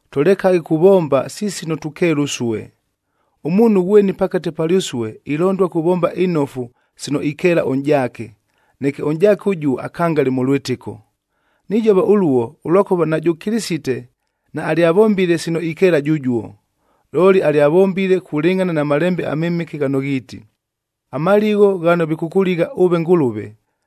Tʉlekaghe kuvomba si sino tukeela ʉsue. Ʉmuunhu ghweni pakate palyʉsue ilondua kuvomba inofu sino ikeela ʉnʼjaake, neke ʉnʼjaake ʉjuo akangale mʉ lwɨtɨko. Nijova ʉluo, ʉlwakʉva najʉ Kɨlɨsite naalyavombile sino ikeela jʉjuo, looli alyavombile kulɨngʼhana na Malembe aMɨmɨke ghano ghiiti, “Amaligho ghano vikʉkʉligha ʉve Ngʉlʉve,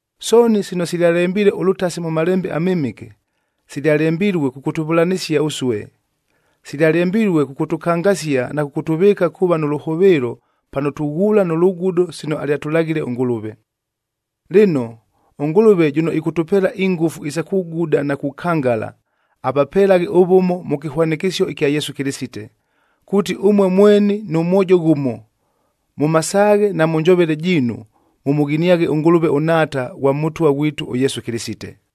Sooni sino silyalembilue ʉlʉtasi mʉ Malembe aMɨmɨke, silyalembilue kʉkʉtʉvʉlanɨsia ʉsue. Silyalembilue kʉkʉtʉkangasia na kʉkʉtʉvɨɨka kuuva nʉ lʉhʉvɨɨlo pano tughuula nʉ lugudo sino alyatʉlaghile ʉNgʉlʉve. Lɨno, ʉNgʉlʉve jʉno ɨkʉtʉpeela ingʉfu isa kuguda na kukangala, avapelaghe ʉvʉmo mʉ kɨhwanɨkɨsio ɨkya Yesu Kɨlɨsite, kuuti ʉmue mweni nʉ mwojo ghʉmo, mʉ masaaghe na mʉ njovele jiinu mʉmʉghiniaghe ʉNgʉlʉve ʉNhaata ghwa Mʉtwa ghwitu ʉYesu Kɨlɨsite.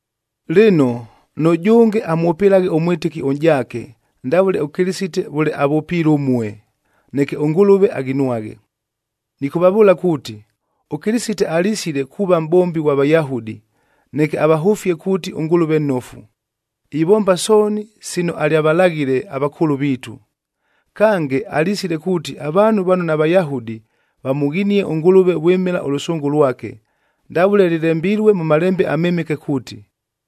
Lɨno, nʉjʉnge amwʉpɨlaghe ʉmwɨtɨki ʉnʼjaake ndavʉle ʉKɨlɨsite vʉle avʉpiile ʉmue, neke ʉNgʉlʉve aghinwaghe. Nɨkʉvavʉʉla kuuti, ʉKɨlɨsite alisile kuuva mʼbombi ghwa Vayahudi, neke avahʉfie kuuti ʉNgʉlʉve nnofu, ivomba sooni sino alyavalaghile avakʉʉlʉ viitu. Kange, alisile kuuti avaanhu vano naVayahudi vamʉghinie ʉNgʉlʉve vwɨmɨla ʉlʉsʉngʉ lwake, ndavʉle lɨlembilue mʉ Malembe aMɨmɨke kuuti,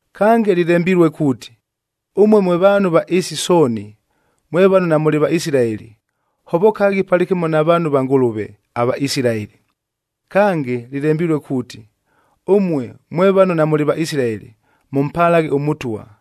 Kange, lɨlembilue kuuti, “Ʉmue mwe vaanhu va ɨɨsi sooni, mwe vano namʉlɨ Vaisilaeli, hovokaghi palɨkɨmo na vaanhu va Ngʉlʉve, Kange, lɨlembilue kuuti, “Ʉmue mwe vano namʉlɨ Vaisilaeli, mʉmpalaghe ʉMʉtwa,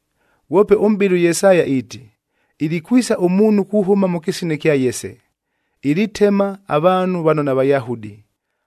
Ghwope ʉmʼbɨli ʉYesaya iiti, “Ilikwisa ʉmuunhu kuhʉma mʉ kɨsina kya Yese, ilitema avaanhu vano naVayahudi,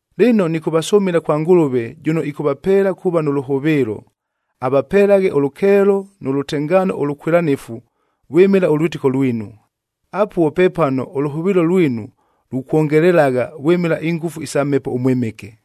Lɨno, nɨkʉvasʉmɨla kwa Ngʉlʉve jʉno ɨkʉvapelela kuuva nʉ lʉhʉvɨɨlo, avapelaghe ʉlʉkeelo nʉ lʉtengaano ʉlʉkwɨlanɨfu vwɨmɨla ʉlwɨtɨko lwinu. Apuo pepano ʉlʉhʉvɨɨlo lwinu lukwongelelagha vwɨmɨla ingʉfu isa Mhepo ʉMwɨmɨke.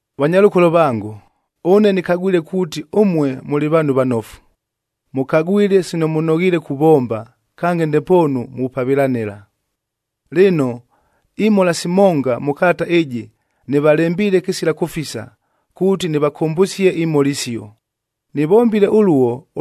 Vanyalʉkolo vango, ʉne nɨkagwile kuuti, ʉmue mʉlɨ vaanhu vanofu, mʉkagwile sino mʉnoghiile kuvomba, kange ndepoonu mupavɨlanɨla. Lɨno, imhola simonga mʉ kalata ɨjɨ nɨvalembiile kɨsila kʉfisa kuuti nɨvakʉmbʉsie imhola isio. Nɨvombile ʉluo,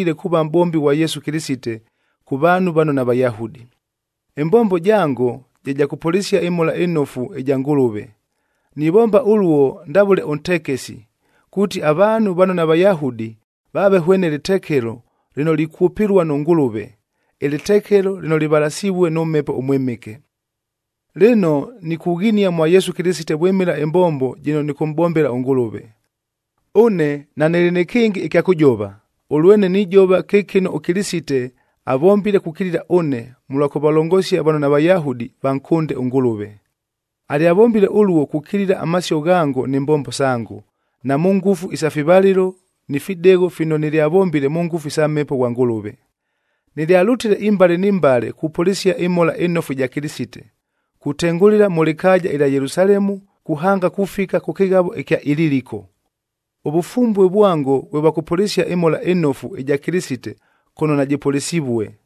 kuuva mʼbombi ghwa Yesu Kɨlɨsite kʉ vaanhu vano naVayahudi. Ɨmbombo jango je ja kʉpʉlɨsia ɨMhola ɨNofu ɨja Ngʉlʉve. Nivomba ʉluo ndavʉle ʉntekesi, kuuti avaanhu vano naVayahudi vaave hwene lɨtekelo lɨno likwʉpɨlua nʉ Ngʉlʉve, ɨlɨtekelo lɨno lɨvalasivue nʉ Mhepo ʉMwɨmɨke. Lɨno, nikughinia mwa Yesu Kɨlɨsite vwɨmɨla ɨmbombo jɨno nɨkʉmʼbombela ʉNgʉlʉve. Ʉne nanɨlɨ nɨ kɨngɨ ɨkya kʉjova, ʉlwene nijova kɨ kɨno ʉKɨlɨsite avombile kukilila ʉne, mʉlwa kʉvalongosia vano naVayahudi vankʉnde ʉNgʉlʉve. Alyavombile ʉluo kukilila amasio ghango ni mbombo sango, na mʉ ngʉfu isa fivalɨlo ni fidegho fino nɨlyavombile mʉ ngʉfu isa Mhepo ghwa Ngʉlʉve. Nɨlyalʉtile imbale ni mbale kupʉlɨsia ɨMhola ɨNofu ɨja Kɨlɨsite, kutengʉlɨla mʉ lɨkaaja ɨlya Yelusalemu kuhanga kufika kʉ kɨghavog ɨkya Ililiko. Ʉvʉfumbue vwango vwe vwa kʉpʉlɨsia ɨMhola ɨNofu ɨja Kɨlɨsite kʉno najɨpʉlɨsivue.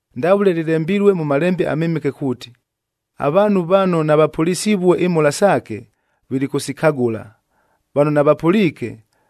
Ndavʉle lɨlembilue mʉ Malembe aMɨmɨke kuuti, “Avaanhu vano navapʉlɨsivue imhola saake, vilikʉsikagʉla, vano navapʉliike,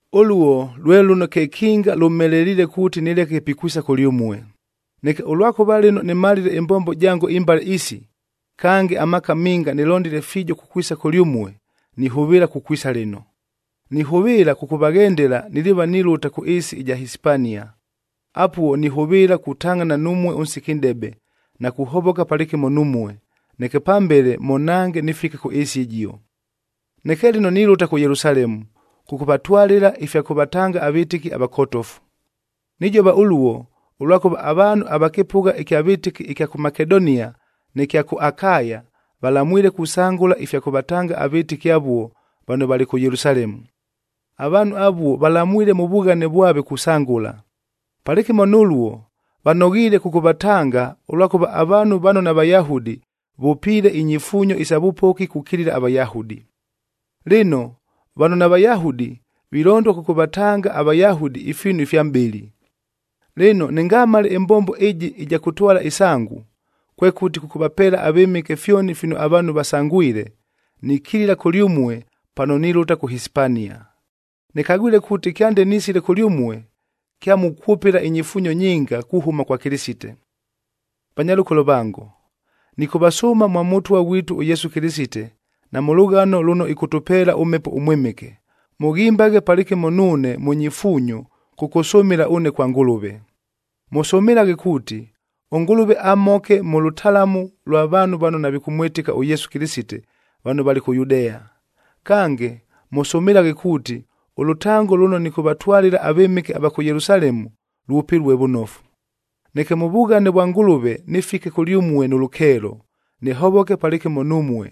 Ʉluo lwe lʉno kekinga lʉmheleliile kuuti nɨleke pikwisa kʉlyʉmue. Neke ʉlwakʉva lɨno nɨmalile ɨmbombo jango imbale isi, kange amaaka minga nɨlondile fiijo kukwisa kʉlyʉmue, nihʉvɨɨla kukwisa lɨno. Nihʉvɨɨla kʉkʉvaghendela niliiva nilʉta kʉ ɨɨsi ɨja Hisipania. Apuo nihʉvɨɨla kutangʼhana numue ʉnsiki nʼdebe, na kuhovoka palɨkɨmo numue, neke pambele mʉnhange nɨfike kʉ ɨɨsi ɨjio. Neke lɨno nilʉta kʉ Yelusalemu, kʉkʉvatwalɨla ifya kʉvatanga avɨtɨki avakotofu. Nijova ʉluo, ʉlwakʉva avaanhu ava kɨpʉgha ɨkya vɨtɨki ɨkya kʉ Makedonia nɨ kya kʉ Akaya valamwile kusangʉla ifya kʉvatanga avɨtɨki avuo vano valɨ kʉ Yelusalemu. Avaanhu avuo valamwile mʉ vughane vwave kusangʉla. Palɨkɨmo nʉluo vanoghiile kʉkʉvatanga, ʉlwakʉva avaanhu vano naVayahudi vʉpiile inyifuunyo isa vʉpoki kukilila aVayahudi. Lɨno, vano naVayahudi vilondua kʉkʉvatanga aVayahudi ifiinu ifya mʼbɨlɨ. Lɨno, nɨngamale ɨmbombo ɨjɨ ɨja kʉtwala ɨsangu, kwekʉti kʉkʉvapeela avɨmɨke fyoni fino avaanhu vasangwile, nikilila kʉlyʉmue pano nilʉta kʉ Hisipania. Nɨkagwile kuuti kyande nisile kʉlyʉmue, kyamukwʉpɨla inyifuunyo nyinga kuhʉma kwa Kɨlɨsite. Vanyalʉkolo vango, nɨkʉvasʉʉma mwa Mʉtwa ghwitu ʉYesu Kɨlɨsite na mʉ lʉghano lʉno ɨkʉtʉpeela ʉMhepo ʉMwɨmɨke, mʉghimbaghe palɨkɨmo nuune mʉ nyifuunyo kʉkʉsʉmɨla ʉne kwa Ngʉlʉve. Mʉsʉmɨlaghe kuuti, ʉNgʉlʉve amhoke mʉ lʉtalamu lwa vaanhu vano navikʉmwɨtɨka ʉYesu Kɨlɨsite vano valɨ kʉ Yudea. Kange, mʉsʉmɨlaghe kuuti ʉlʉtango lʉno nɨkʉvatwalɨla avɨmɨke ava kʉ Yelusalemu lwʉpɨlue vʉnofu, neke mʉ vughane vwa Ngʉlʉve nɨfike kʉlyʉmue nʉ lʉkeelo, nɨhovoke palɨkɨmo numue.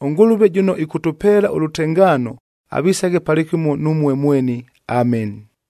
ɄNgʉlʉve jʉno ɨkʉtʉpeela ʉlʉtengaano avisaghe palɨkɨmo numue mweni. Ameni.